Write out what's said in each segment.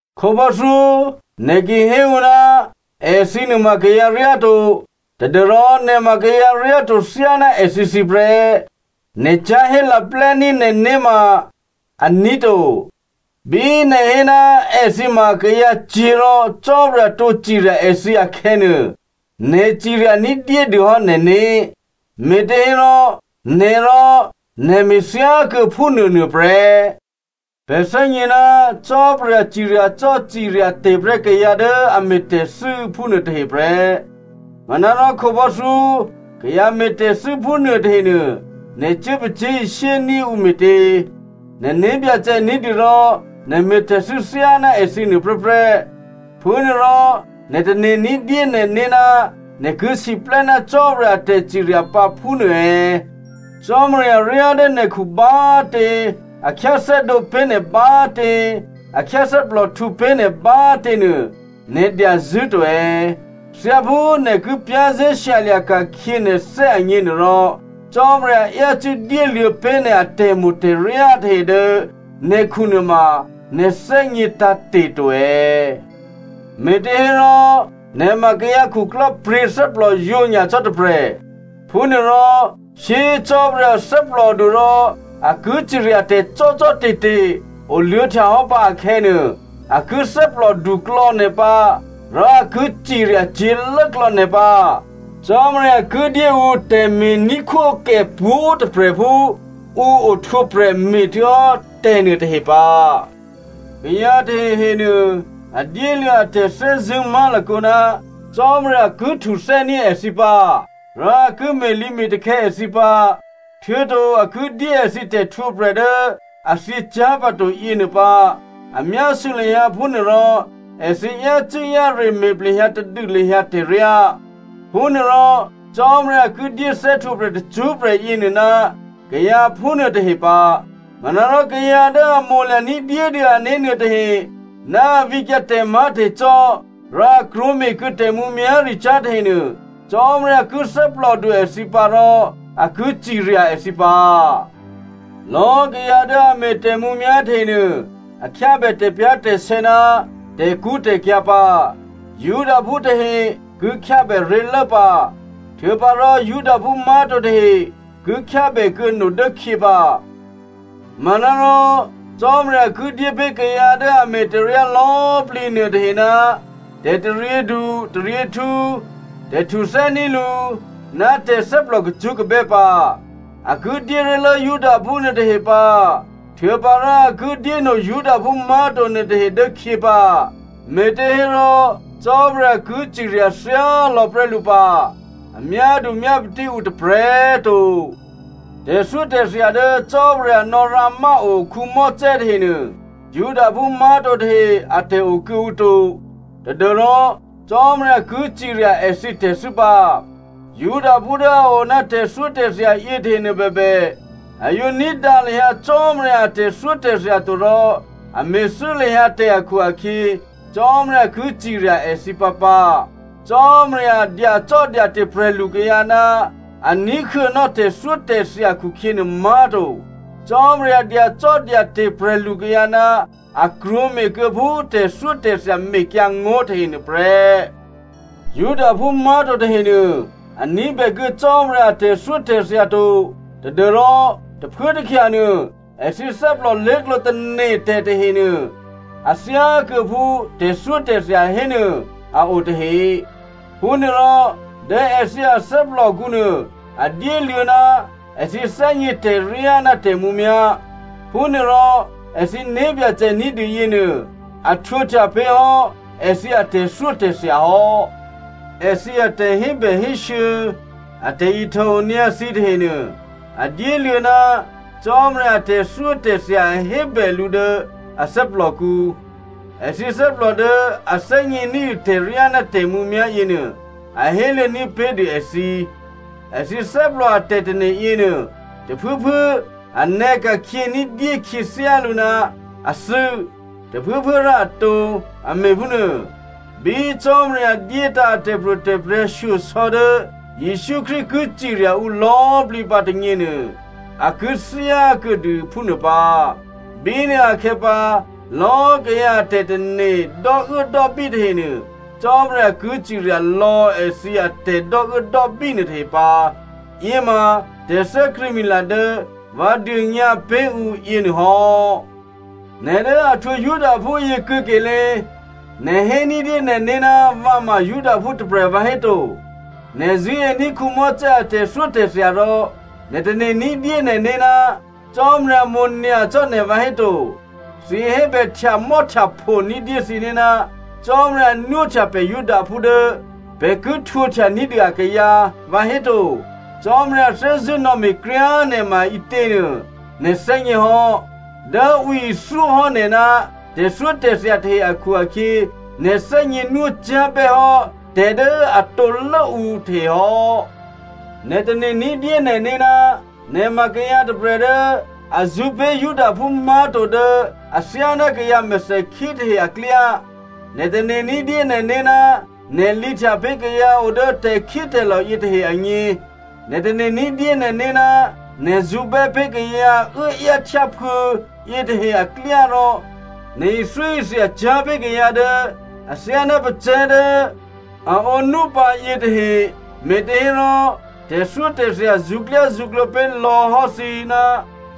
Khǒbò́thyó, nè̤ ki hé ǔ, “Èthǐ nuôma kayǎ ryáto,” tadû́rò nè̤ ma kayǎ ryáto thyáná èthǐthǐ prè́. Nè̤ cyá̤hé laplè́ní̤ nè̤né̤ ma aní̤ to. Bí nè̤ hé ná èthǐ ma kayǎcyě̤ rò Cò́marya tǒ cirya èthǐ akhè̌nuô, nè̤ cirya ní̤dyédû hò́ nè̤né̤, me̤těhérò nè̤ rò nè̤ me̤ thyákuô̌ phúnuônuô prè́. Pè̤ thè́gně ná Cò́marya ciryacò́ ciryate̤ prè́ kayǎ dố a me̤ tè̤thû́ phúnuôtahe prè́. Manárò khǒbò́thyó, kayǎ me̤ tè̤thû́ phúnuô tahenuô, nè̤ cuố pacyé̤ishyé ní̤ ǔ me̤tě? Nè̤ né̤byacè ní̤dû rò nè̤ me̤ tè̤thû́ thyáná èthǐ nuô prè́prè́. Phúnuôrò, nè̤ tane̤ ní̤dyé nè̤né̤ ná nè̤ ki siplè́ ná Cò́marya a tè̤cirya pǎ phúnuô è̌? Cò́marya ryá dố nè̤khu bá꤮ tě, a khyáthè́dǒ pé̤ nè̤ bá꤮ tě, a khyáthè́plòhtǔ pé̤ nè̤ bá꤮ tě nuô, nè̤ dyazṳ̂́to è̌? Thyáphú nè̤ ki za̤ ní̤dû nè̤né̤ agněnuôrò, Cò́marya yácû́ dyéluô̌ pé̤ nè̤ atè̤mo̤ tè̤ryá tahe dố nè̤khu nuôma nè̤ thè́gně tǎ̤te̤ to è̌? Me̤těhérò nè̤ ma kayǎ khuklò́pryě̤thè́plòyǒ nyacò́ tôprè̤, phúnuôrò, shyé꤮ Cò́marya thè́plòdu rò a ki ciryatè̤ cò́cò́te̤te̤ oluô̌htyahò́ pǎ akhè̌nuô, a ki thè́plò duklò̌ nè̤ pǎ rò a ki cirya cyě̤lốklò̌ nè̤ pǎ. Cò́marya ki dyé ǔ tè̤me̤ní̤khwókè pwǒ̤꤮ tôprè̤ phú ǔ ohtwǒprè̤ me̤htuô̌hò́ tè̤nuô tahe pǎ. Kayǎ tahehe nuô, a dyéluô̌ a tè̤thè́zṳ̂́ má̤lakǒ ná Cò́marya ki htuthè́ní̤ èthǐ pǎ, rò a ki me̤lǐme̤takhè̌ èthǐ pǎ, htuô̌to a ki dyé èthǐ tè̤htwǒprè̤ dố a thyěcyá̤pǎto yěnuô pǎ a myásû̌ lahyǎ phúnuôrò èthǐ yácû́-yáre me̤ plehyǎ tadû lahyǎ tè̤ryá. Phúnuôrò Cò́marya ki dyé thè́htwǒprè̤ tacṳ́prè̤ yěnuô ná kayǎ phúnuôtahe pǎ. Manárò kayǎ dố a mo̤lya̤ ní̤dyédû ané̤ nuôtahe, ná a vǐkyǎ tè̤má̤tè̤cò́, rò a krwǒme̤kuô̌ tè̤mǔmyá̤ricyá̤ tahenuô, Cò́marya ki thè́plòdu èthǐ pǎ rò a ki cirya èthǐ pǎ. Lò̌꤮ kayǎ dố a me̤ tè̤mǔmyá̤ tahenuô, a khyábè tè̤pyá̤tè̤sè̌ ná tè̤kṳ́tè̤kyǎ̤ pǎ. Judaphú tahe ki khyábè ré̤lố pǎ, htuô̌pǎrò Judaphú má̤to tahe ki khyábèkuô̌ no dốkhyě pǎ. Manárò Cò́marya ki dyépé̤ kayǎ dố a me̤ tè̤ryá lò̌꤮ plǐ nuôtahe, tè̤taryědu taryěhtǔ, tè̤htuthè́ní̤ lǔ ná tè̤thè́plò kacṳ́kabè́ pǎ. A ki dyé ré̤lố Judaphú nuôtahe pǎ htuô̌pǎrò a ki dyéno Judaphú má̤to nuôtahe dố khyě pǎ. Me̤těhérò Cò́marya ki cirya thyálò̌ prè́ lǔ pǎ. A myádu myápatí ǔ tôprè̤꤮ to. Tè̤thyótè̤thya dố Cò́marya nò̌rǎmáo Mosè tahenuô Judaphú má̤to tahe atè̤ o kuô̌ǔ to tadû́rò Cò́marya ki cirya èthǐ tè̤thû́ pǎ. Judaphú dố a o ná tè̤thyótè̤thya yětahenuô bèbè, a yǒ ní̤dǎ lahyǎ Cò́marya a tè̤thyótè̤thya to rò a me̤thû́ lahyǎ tè̤ akhu-akhyě, Cò́marya ki cirya èthǐ pǎpǎ. Cò́marya dyacò́dyate̤ prè̤lukayǎ ná a ní̤huô̌nò́ tè̤thyótè̤thya khukhyěnuô má̤to. Cò́marya dyacò́dyate̤ prè̤lukayǎ ná a krwǒme̤kuô̌ phú tè̤thyótè̤thya mekyǎ ngó̤ nuôtahe prè́. Judaphú má̤to tahenuô a ní̤bèkuô̌ Cò́marya a tè̤thyótè̤thya to tadû́rò tôphuốtôkhyanuô, èthǐ thè́plò lé̤klǒ tane̤ tè̤tahenuô a thyákuô̌ phú tè̤thyótè̤thya hénuô a o tahe. Phúnuôrò dố èthǐ athè́plòkǔ nuô a dyéluô̌ ná èthǐ thè́gně tè̤ryá ná tè̤mǔmyá̤. Phúnuôrò èthǐ né̤byacè ní̤dû yěnuô a htwǒhtya pé̤ hò́ èthǐ atè̤thyótè̤thya hò́. Èthǐ atè̤hébèhésû̌, a tè̤ihtòonyǎ thǐ tahenuô, a dyéluô̌ ná Cò́marya a tè̤thyótè̤thya hébè lǔ dố a thè́plòkǔ. Èthǐ thè́plò dố a thè́gně ní̤dû tè̤ryá ná tè̤mǔmyá̤ yěnuô a héluô̌ ní̤pé̤dû èthǐ. Èthǐ thè́plò a tè̤tane̤ yěnuô, tôphuốphuố a nè̌ka̤khyě ní̤dyé khyěthyálǔ ná a thû́, tôphuốphuố rò a tǒ, a me̤ phúnuô. Bí Cò́marya dyétǎ̤ a tè̤pro̤tè̤prya̤ shyosò̌ dố Jesǔ Krístu ki cirya ǔ lò̌꤮ plǐ pǎ tônyěnuô, a ki thyá kuô̌dû phúnuô pǎ. Bínuôakhè̌pǎ, lò̌꤮ kayǎ a tè̤tane̤ dò́uốdò́bí tahenuô, Cò́marya ki cirya lò̌ èthǐ atè̤dò́uốdò́bí nuôtahe pǎ. Yěma tè̤thè́krṳ̂̌mila dố vǎ dônyǎ pé̤ ǔ yěnuôhò́. Nè̤ dố a htwǒ Judaphú yě kuô̌kelé꤮, nè̤ hé ní̤dyé nè̤né̤ ná vǎ ma Judaphú tôprè̤ vǎhéto. Nè̤ zṳ̂́ení̤ Mosè a tè̤thyótè̤thya rò nè̤ tane̤ní̤dyé nè̤né̤ ná Cò́marya mo̤nyacò́ nè̤ vǎhéto. Thǐ hébè htyamò́htyapho ní̤dyé thǐné̤, “Cò́marya nwóhtya pè̤ Judaphú dố pè̤ ki htwǒhtya ní̤dû akayǎ,” vǎhéto. Cò́marya thè́zṳ̂́ nò̌me̤ kryá꤮ nè̤ maǐtěnuô nè̤ thè́gně hò́. Dố ǔ ithyóhò́ nè̤ ná tè̤thyótè̤thya tahe akhu-akhyě nè̤ thè́gně nwócyá̤ bè́hò́ tè̤dố a tǒlố ǔ tahe hò́. Nè̤ tane̤ ní̤dyé nè̤né̤ ná nè̤ ma kayǎ tôprè̤ dố a zṳ̌pé̤ Judaphú má̤to dố athyáná kayǎ mèthèkhí tahe aklyá. Nè̤ tane̤ ní̤dyé nè̤né̤ ná nè̤ lǐhtya pé̤ kayǎ o dố tè̤khítè̤lò̤ yětahe agně. Nè̤ tane̤ ní̤dyé nè̤né̤ ná nè̤ zṳ̌bè́ pé̤ kayǎ uốáyáhtyáphuô̌ yětahe aklyá rò nè̤ ithyóithyacyá̤ pé̤ kayǎ dố athyáná pacè̤̌ dố a ǒnú pǎ yětahe, me̤těhérò tè̤thyótè̤thya zṳ̌klyázṳ̌klǒ pé̤ lò̌ hò́ thǐ ná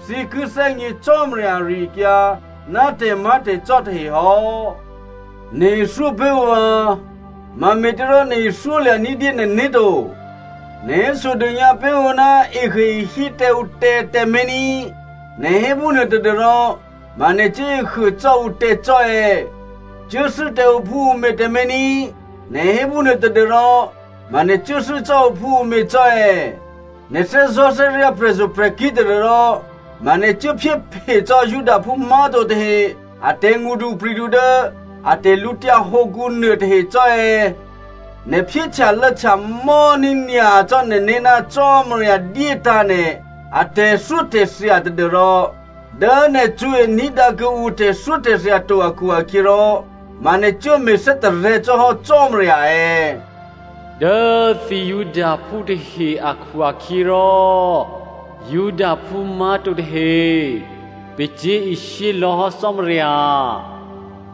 thǐ ki thè́gně Cò́marya ari-akyǎ ná tè̤má̤tè̤cò́ tahe hò́. Nè̤ ithyó pé̤ ǔ vǎ! Mame̤těrò nè̤ ithyólya̤ ní̤dyé nè̤né̤ to? Nè̤ hésodônyǎ pé̤ ǔ ná ehuôehí tǎ ǔ tè̤ tǎmé̤ ní꤮, nè̤ hé phúnuô tadû́rò ma nè̤ cuố ehuô cò́ ǔtè̤ cò́ è̌? Cuốthû́ tǎ ǔphúǔmě tǎmé̤ ní, nè̤ hé phúnuô tadû́rò ma nè̤ cuốthû́ cò́ ǔphúǔmě cò́ è̌? Nè̤ thè́zò̤́thè́ryǎ̤ prè̤zo̤prè̤kí̤ tadû́rò ma nè̤ cuốphyéphe cò́ Judaphú má̤to tahe a tè̤ngṳdupri̤du dố a tè̤lǔtyǎ hǒkǔ nuôtahe cò́ è̌? Nè̤ phyé htyalô̌htyamò́ ní̤nyacò́ nè̤né̤ ná Cò́marya dyétǎ̤ nè̤ atè̤thyótè̤thya tadû́rò dố nè̤ cṳ̌e ní̤dǎ kuô̌ǔ tè̤thyótè̤thya to akhu-akhyěrò, ma nè̤ cuố me̤ thè́tarè̤̌ cò́ hò́ Cò́marya è̌? “Dố thǐ Judaphú tahe akhu-akhyěrò Judaphú má̤to tahe pacyé̤ishyé lò̌ hò́ Cò́marya,”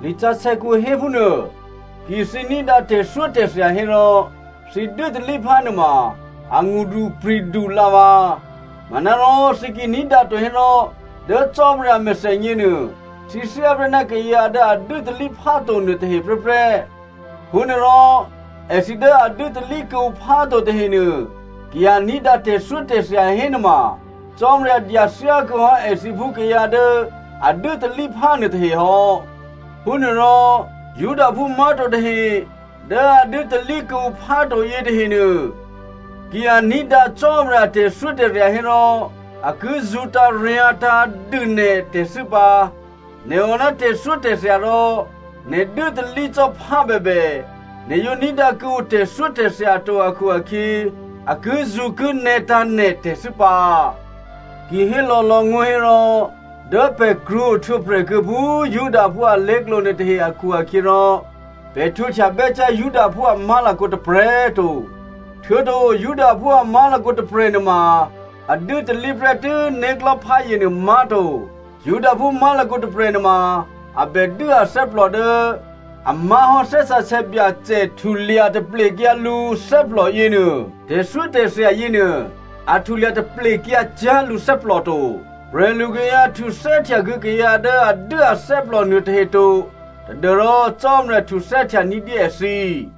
lisǎsè̌kǔ héphúnuô. Ki thǐ ní̤dǎ tè̤thyótè̤thya hérò, thǐ dû́talíphá nuôma a ngṳdupri̤du lǎvǎ. Manárò thǐ ki ní̤dǎto hérò dố Cò́marya a mèthènyě nuô thǐ thyáprè́ ná kayǎ dố a dû́talíphá to nuôtahe prè́prè́. Phúnuôrò èthǐ dố a dû́talí kuô̌ǔ pháto tahenuô ki a ní̤dǎ tè̤thyótè̤thya hénuôma Cò́marya dyathyá kuô̌ hò́ èthǐ phú kayǎ dố a dû́talíphá nuôtahe hò́. Phúnuôrò Judaphú má̤to tahe dố a dû́talí kuô̌ǔ pháto yětahenuô, ki a ní̤dǎ Cò́marya a tè̤thyótè̤thya hérò a ki zṳ̌taryǎ̤tǎ̤ dû nè̤ tè̤thû́ pǎ. Nè̤ o ná tè̤thyótè̤thya rò nè̤ dû́talí cò́ phá bèbè, nè̤ yǒ ní̤dǎ kuô̌ǔ tè̤thyótè̤thya to akhu-akhyě, a kizṳ̌kinè̌tǎ̤ nè̤ tè̤thû́ pǎ. Ki hé lò̌lò̌ngó̤ hérò, dố pè̤ krwǒ ohtwǒprè̤ kuô̌ phú Judaphú alé̤klǒ nuôtahe akhu-akhyěrò pè̤ htwǒhtya bè́cyá̤ Judaphú a má̤lakǒ tôprè̤꤮ to, htuô̌to Judaphú a má̤lakǒ tôprè̤ nuôma a dû́talí prè́tû́ né̤klò̤́pházye nuô má̤to. Judaphú má̤lakǒ tôprè̤ nuôma a bè dû́ athè́plò dố a má̤hò́ Thè́ Sǎsè̌ Byacè htulya taplekyǎ lǔthè́plò yěnuô. Tè̤thyótè̤thya yěnuô a htulya taplekyǎ cyá̤ lǔthè́plò to. Prè̤lukayǎ htuthè́htya kuô̌ kayǎ dố a dû́ athè́plò nuô tahe to tadû́rò Cò́marya htuthè́htya ní̤dyé èthǐ.